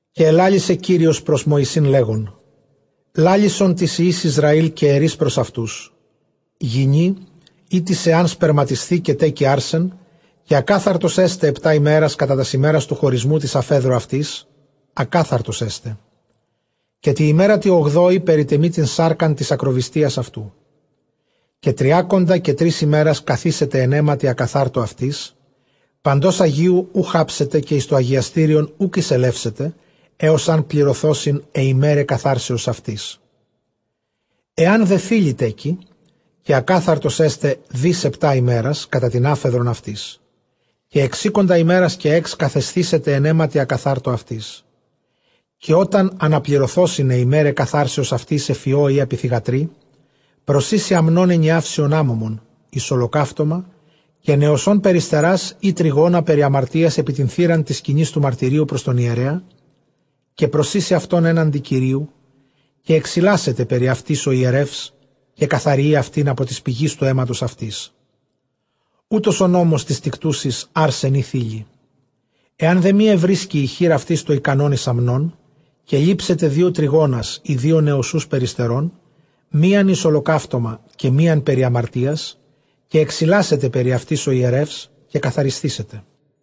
Καὶ ἐλάλησε Κύριος πρὸς Μωυσῆν, λέγων, λάλησον τοῖς υἱοῖς Ἰσραὴλ, καὶ ἐρεῖς πρὸς αὐτοὺς, γυνὴ ἥτις ἐὰν σπερματισθῇ, καὶ τέκῃ ἄρσεν, καὶ ἀκάθαρτος ἔσται ἑπτὰ ἡμέρας· κατὰ τὰς ἡμέρας τοῦ χωρισμοῦ τῆς ἀφέδρου αὐτῆς, ἀκάθαρτος ἔσται. Καὶ τῇ ἡμέρᾳ τῇ ὀγδόῃ περιτεμεῖ τὴν σάρκα τῆς ἀκροβυστίας αὐτοῦ. Καὶ τριάκοντα καὶ τρεῖς ἡμέρας καθήσεται ἐν αἵματι ἀκαθάρτῳ αὐτῆς· παντὸς ἁγίου οὐξ ἅψεται, καὶ εἰς τὸ ἁγιαστήριον οὐκ εἰσελεύσεται, ἕως ἂν πληρωθῶσιν αἱ ἡμέραι καθάρσεως αὐτῆς. Ἐὰν δὲ θῆλυ τέκῃ, καὶ ἀκάθαρτος ἔσται δὶς ἑπτὰ ἡμέρας, κατὰ τὴν ἄφεδρον αὐτῆς· καὶ ἑξήκοντα ἡμέρας καὶ ἓξ καθεσθήσεται ἐν αἵματι ἀκαθάρτῳ αὐτῆς. Καὶ ὅταν ἀναπληρωθῶσιν αἱ ἡμέραι καθάρσεως αὐτῆς ἐφʼ υἱῷ ἢ ἐπὶ θυγατρι, προσοίσει ἀμνὸν ἐνιαύσιον ἄμωμον εἰς ὁλοκαύτωμα, καὶ νοσσὸν περιστερᾶς ἢ τρυγόνα περὶ ἁμαρτίας ἐπὶ τὴν θύραν τῆς σκηνῆς τοῦ μαρτυρίου, πρὸς τὸν ἱερέα. Καὶ προσοίσει αὐτὸν ἔναντι Κυρίου· καὶ ἐξιλάσεται περὶ αὐτῆς ὁ ἱερεὺς, καὶ καθαριεῖ αὐτὴν ἀπὸ τῆς πηγῆς τοῦ αἵματος αὐτῆς· οὗτος ὁ νόμος τῆς τικτούσης ἄρσεν ἢ θῆλυ. Ἐὰν δὲ μὴ εὑρίσκῃ ἡ χεὶρ αὐτῆς τὸ ἱκανὸν εἰς ἀμνὸν, καὶ λήψεται δύο τρυγόνας ἢ δύο νοσσοὺς περιστερῶν, μίαν εἰς ὁλοκαύτωμα, καὶ μίαν περὶ ἁμαρτίας· καὶ ἐξιλάσεται περὶ αὐτῆς ὁ ἱερεὺς, καὶ καθαρισθήσεται.